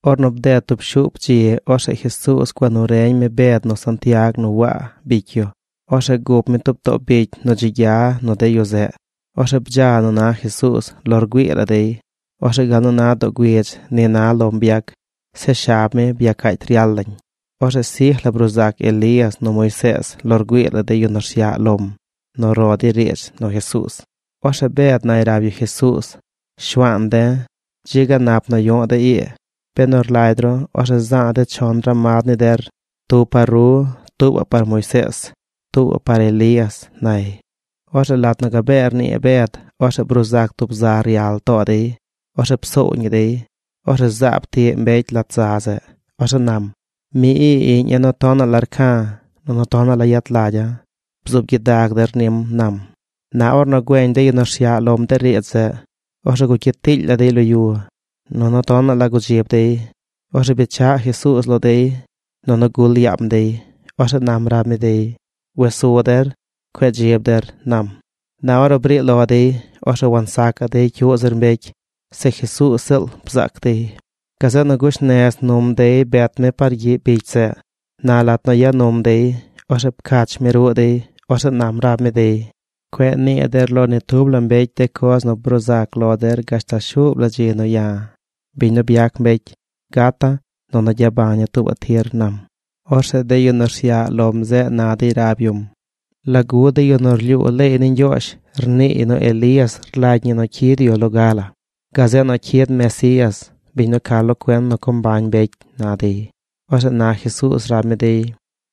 Ornu bded tub shuup dzi, orzeꞌ Jesuuz gua nu reñ mi Bed nu Santiag nu Waa, bicy yu. Orzeꞌ gup mi too tub bicy nu dzi gya nu de yu zeꞌ. Orzeꞌ bdza nu na Jesuuz lo rgüii la dey. Orzeꞌ gal nu na doo güidz ni na lom byac. Zeꞌ shab mi byacaacy ryal lañ. Orzeꞌ sij la bruu zac Elías nu Moisees, lo rgüii la de yu nu rsyaꞌ lom, nu ro dey riidz nu Jesuuz. Orzeꞌ Bed nay rab yu Jesuuz: ―Shuaan de̱, ¡dzi ga nap nu yu̱ꞌ de̱ ii! Benu rlagy ru, orzeꞌ za̱a̱ de̱ chon ramad ni der: tub par ru, tuubaꞌ par Moisees, tuubaꞌ par Elías ―nay. Orzeꞌ lat nu gabee rnii Bed, orzeꞌ bruu zac tub za ryal too dey. Orzeꞌ psoow ñi dey. Orzeꞌ zaab tiꞌ mbecy lat za zeꞌ. Orzeꞌ nam: ―Mi ii iꞌña̱ nu tonaꞌ la rca̱, nunu tonaꞌ la yet lagya̱. Bzuub gyidag der nim ―nam. Na ornu güeñ de yu nu rsyaꞌ lom de riidz zeꞌ, orzeꞌ gugyit tiily la dey lo yu. Nunu tonaꞌ la gudzib dey. Orzeꞌ bechaꞌ Jesuuz lo dey nunu gul yaam dey. Orzeꞌ nam rab mi dey: ―Wes su der. Cueꞌ dzib der ―nam. Na ornu briꞌ lo dey, orzeꞌ wansacaꞌ dey cyuꞌ zir mbecy. Se Jesuuz ziꞌl bzaac dey. Gazeꞌ nu gush nez num dey bet mi par gyiꞌ bicy zeꞌ. Na lat nu ya num dey, orzeꞌ pcach mi ruꞌ dey. Orzeꞌ nam rab mi dey: ―Cueꞌ nii der lo ni tub la mbecy de coz nu bruu zac lo der gashtal shuub la dzi nu ya̱, biñ nu byac mbecy, gata̱ nunu gyabaña̱ tuubaꞌ tir ―nam. Orzeꞌ de yu nu rsyaꞌ lom zeꞌ na dey rab yum: ―¿Lagu de yu nu rlyuu leey ni Ñgyoozh rniiy nu Elías rlagy ñi nu cyid yu loga la? Gazeꞌ nu cyid Mesías, biñ nu ca lo cuen nu co mbañ mbecy ―na dey. Orzeꞌ na Jesuuz rab mi dey: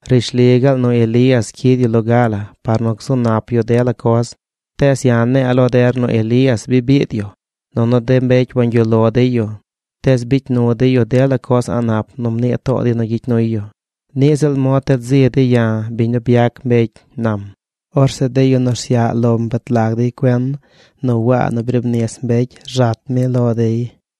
―Rishli gaal nu Elías cyid yu loga la par nu gzu nap yu de la coz. Tees ya̱ ne̱e̱ lo der nu Elías bi biid yu, nunu de mbecy wangyuꞌ lo dey yu, tees bicy nu dey yu dela coz a̱ꞌ nap nu mnii too dey nu gyicy nuy yu. Niꞌ ziꞌl mod ted zi dey ya̱, biñ nu byac mbecy ―nam. Orzeꞌ de yu nu rsyaꞌ lom bet lag dey cuen nu Waa nu briib nis mbecy rzat mi lo dey.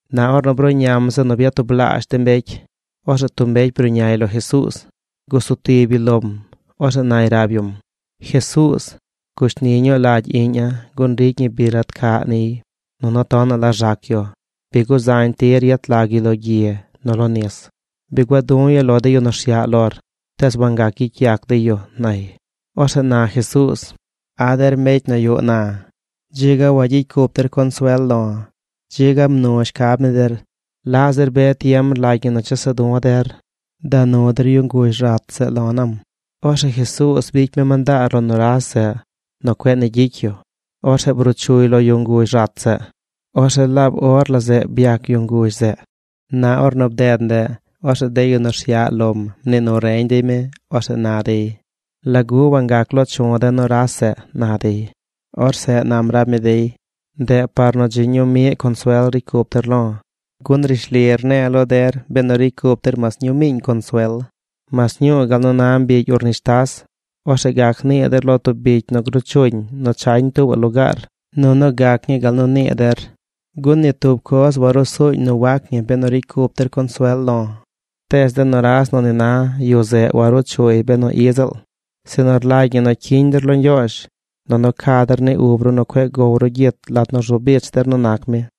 Na ornu bruꞌñam zeꞌ nu byatublaazh de mbecy, orzeꞌ tub mbecy bruꞌñay lo Jesuuz. Gusu tib yu lom. Orzeꞌ nay rab yum: ―Jesuuz, gushni ñuu lagy iꞌña̱ gun ricy ñi bi rat caꞌ niy. Nunu tonaꞌ la rzac yu. Bi guzañ tir yet lag yu lo gyi nu lo nis. Bi gua̱ du̱ yu lo de yu nu rsyaꞌ lor, tees wangac gyicy yac dey yu ―nay. Orzeꞌ na Jesuuz: ―¡A der mbecy nu yuꞌ na! Dzi ga wagyicy cup der consuel lo̱. Dzi ga mnu shcab ni der. ¿Laꞌ zir be tiem rlagy ñi nu chesa̱ du̱ der? Da nu der yu nguzh rat zeꞌ lo̱ ―nam. Orzeꞌ Jesuuz bicy mi mandaar lo nuras zeꞌ nu cueꞌ ni gyicy yu. Orzeꞌ bruu chuy lo yu nguzh rat zeꞌ. Orzeꞌ laab or la zeꞌ byac yu nguzh zeꞌ. Na ornu bded ndeꞌ, orzeꞌ de yu nu rsyaꞌ lom mnii nu reñ dey mi. Orzeꞌ na dey: ―¿Lagu wangac loo chu̱ de̱ nuras zeꞌ? ―na dey. Orzeꞌ nam rab mi dey: ―Ndeꞌ par nu dzi ñuu miꞌ consuel ricy cup der lo̱. Gun rishli rne̱e̱ lo der benu ricy cup der mas ñuu miiñ consuel, mas ñuu gal nu na mbigy urnishtas, orzeꞌ gac nii der lo tub bicy nu gruu chuñ nu chañ tuubaꞌ lugaar nunu gac ñii gal nu nii der. Gun ni tub coz warusuñ nu wac ñi benu ricy cup der consuel lo̱. Tees de nuras nu ni na, yu zeꞌ waruu chuy benu i ziꞌl, sinu rlagy ñi nu cyiñ der lo Ñgyoozh, nunu ca der ni ub ru nu cueꞌ gow ru gyit lat nu rzu bich der nu nac mi.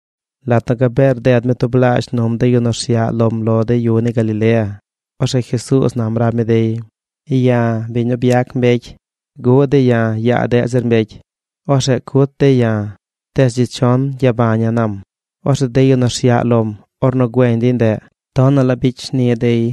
Lat nu gabee rded mi tublaazh num de yu nu rsyaꞌ lom lo de yu ni Galilea, orzeꞌ Jesuuz nam rab mi dey: ―Ya̱, biñ nu byac mbecy, guꞌ dey ya̱ yaa deꞌ zir mbecy. Orzeꞌ cut dey ya̱. Tees dzi chon gyabaña̱ ―nam. Orzeꞌ de yu nu rsyaꞌ lom, ornu güeñ dey ndeꞌ, tonaꞌ la bicy shni dey.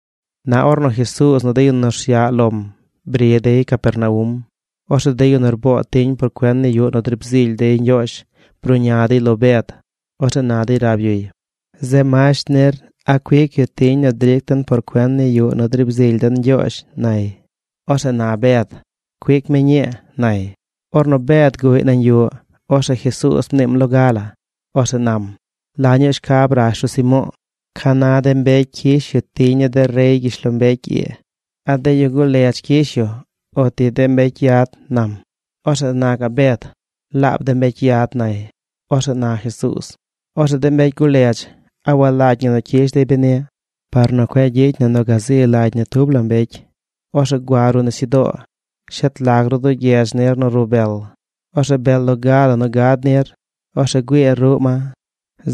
Na ornu Jesuuz nu de yu nu rsyaꞌ lom bri dey Capernaum, orzeꞌ de yu nu rboo tiñ por cuen ni yuꞌ nu driib zily dey Ñgyoozh bruꞌña dey lo Bed. Orzeꞌ na dey rab yuy: ―Zeꞌ masht nir, ¿a cuic yu tiñ nu dric den par cuen ni yuꞌ nu riib zily den Ñgyoozh? ―nay. Orzeꞌ na Bed: ―Cuic mi ñii ―nay. Ornu Bed guꞌy nañ yu, orzeꞌ Jesuuz mniim loga la. Orzeꞌ nam: ―¿La ñuu shcab rash ru Simo̱o̱? ¿Ca na de mbecy cyish yu tiñ ni de rey gyishlombecy ii? ¿A de yu guledz cyish yu, uti de mbecy yad? ―nam. Orzeꞌ na gaꞌ Bed: ―Laab de mbecy yad ―nay. Orzeꞌ na Jesuuz: ―Orzeꞌ de mbecy guledz, ¿a walagy ñi nu cyish dey beni? Par nu cueꞌ gyicy na nu gazi lagy ni tub la mbecy, orzeꞌ gua ruꞌ nisyudoo. Shet lag ru duu gyedz nir nu rub bel. Orzeꞌ bel loga la nu gad nir, orzeꞌ güiir ruꞌ ma.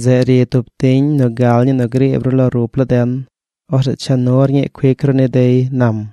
Zeꞌ ri tub tiñ nu gal ñii nu griib ru lo rup laa den. Orzeꞌ cha nur ñii cuic ru ni dey ―nam.